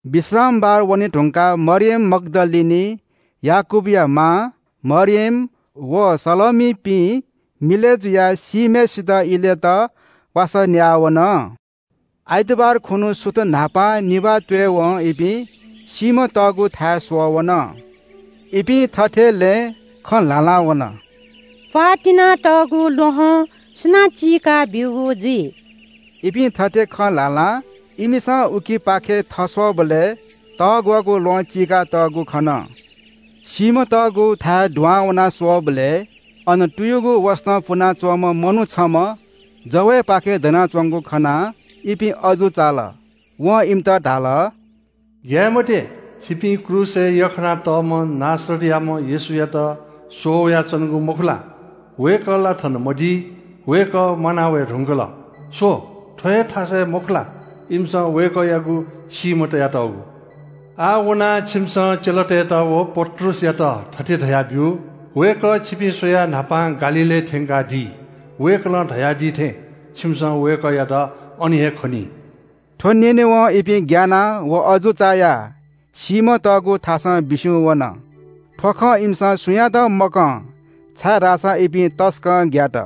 विश्रामबार वने धुंकाः मरियम मग्‍दलिनी, याकूबया मां मरियम व सलोमीपिं मिलय् जुयाः सीम्‍हय् इलेत वासः न्‍याः वन। आइतबार खुन्‍हु, सुथ न्‍हापां निभाः त्‍वयेवं इपिं चिहानय् स्‍वःवन। इपिं लँय् थथे हा हां वन – “प्‍वाः तिनातःगु ल्‍वहं सुनां चीका बीगु जुइ?” थथे हा हां इमिसं उखेपाखे थस्‍वःबलय् तग्‍वःगु ल्‍वहं चीकातःगु खन। चिहानय् दुहां वनाः स्‍वःबलय् अन तुयुगु वसतं पुना च्‍वंम्‍ह मनू छम्‍ह जवय्‌पाखे दनाच्‍वंगु खनाः इपिं अजू चाल। वं इमित धाल – “ग्‍याये मते। छिपिं क्रूसय् यख्‍खानातःम्‍ह नासरतयाम्‍ह येशूयात स्‍वःवयाच्‍वनागु मखु ला? वय्‌कः ला थन मदी। वय्‌कः म्‍वाना वये धुंकल। स्‍व, थ्‍व हे थासय् मखु ला, इमिसं वय्‌कःयागु सीम्‍ह तयातःगु? आः वनाः छिमिसं चेलातय्‌त व पत्रुसयात थथे धयाब्‍यु – ‘वय्‌कः छिपिं स्‍वयाः न्‍हापां गालीलय् थ्‍यंकादी। वय्‌कलं धयादी थें छिमिसं वय्‌कःयात अन हे खनी।’” थ्‍व न्‍यनेवं इपिं ग्‍यानाः व अजू चायाः चिहानं बिस्‍युं वन। थ्‍व खँ इमिसं सुयातं मकं, छाय्‌धाःसा इपिं तसकं ग्‍यात।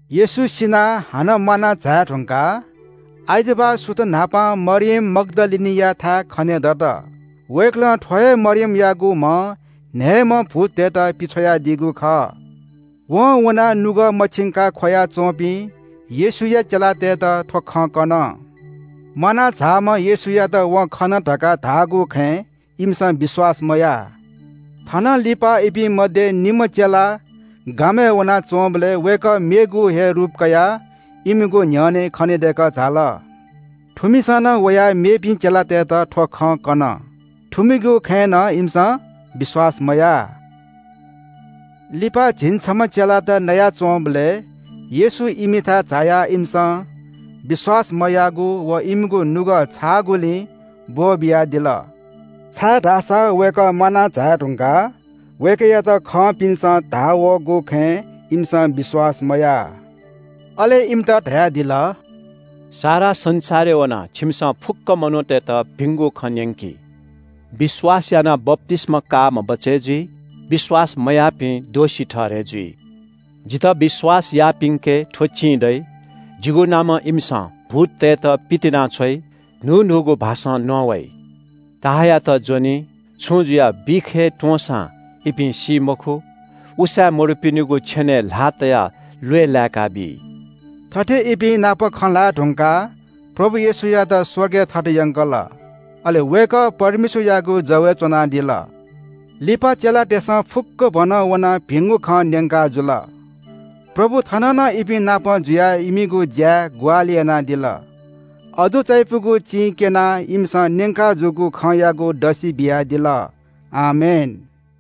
येशू सिनाः हानं म्‍वाना झाये धुंकाः आइतबार सुथ न्‍हापां मरियम मग्‍दलिनीयाथाय् खनेदत। वय्‌कलं थ्‍व हे मरियमयागु म्‍हं न्‍हय्‌म्‍ह भूततय्‌त पिछ्वयादीगु खः। वं वनाः नुगः मछिंकाः ख्‍वया च्‍वंपिं येशूया चेलातय्‌त थ्‍व खँ कन। म्‍वाना झाःम्‍ह येशूयात वं खन धकाः धाःगु खँय् इमिसं विश्‍वास मयाः। थनंलिपा इपिं मध्‍ये निम्‍ह चेला गामय् वनाच्‍वंबलय् वय्‌कः मेगु हे रूप कयाः इमिगु न्‍ह्यःने खनेदय्‌कः झाल। थुमिसं नं वयाः मेपिं चेलातय्‌त थ्‍व खँ कन। थुमिगु खँय् नं इमिसं विश्‍वास मयाः। लिपा झिंछम्‍ह चेलातय् नयाच्‍वंबलय् येशू इमिथाय् झायाः इमिसं विश्‍वास मयाःगु व इमिगु नुगः छाःगुलिं ब्‍वःबियादिल, छाय्‌धाःसा वय्‌कः म्‍वाना झाये धुंकाः वय्‌कःयात खंपिन्‍सं धाः वःगु खँय् इमिसं विश्‍वास मयाः। अले इमित धयादिल – “सारा संसारय् वनाः छिमिसं फुक्‍क मनूतय्‌त भिंगु खँ न्‍यंकि। विश्‍वास यानाः बप्‍तिस्‍मा काःम्‍ह बचय् जुइ, विश्‍वास मयाःपिं दोषी ठहरय् जुइ। जितः विश्‍वास याःपिन्‍के थ्‍व चिं दइ – जिगु नामं इमिसं भूततय्‌त पितिनाछ्वइ, न्‍हू न्‍हूगु भाषां नवाइ, सर्पयात ज्‍वनी, छुं जुयाः बिख हे त्‍वंसां इपिं सी मखु, उसाँय् मदुपिनिगु छेनय् ल्‍हाः तयाः ल्‍वय् लाय्‌काबी।” थथे इपिं नाप खँ ल्‍हाये धुंकाः प्रभु येशूयात स्‍वर्गय् थत यंकल। अले वय्‌कः परमेश्‍वरयागु जवय् च्‍वनादिल। लिपा चेलातय्‌सं फुक्‍कभनं वनाः भिंगु खँ न्‍यंकाजुल। प्रभु थः नं इपिं नाप जुयाः इमिगु ज्‍याय् ग्‍वाहालि यानादिल। अजू चायापुगु चिं क्‍यनाः इमिसं न्‍यंकाजूगु खँयागु दसि बियादिल। आमेन।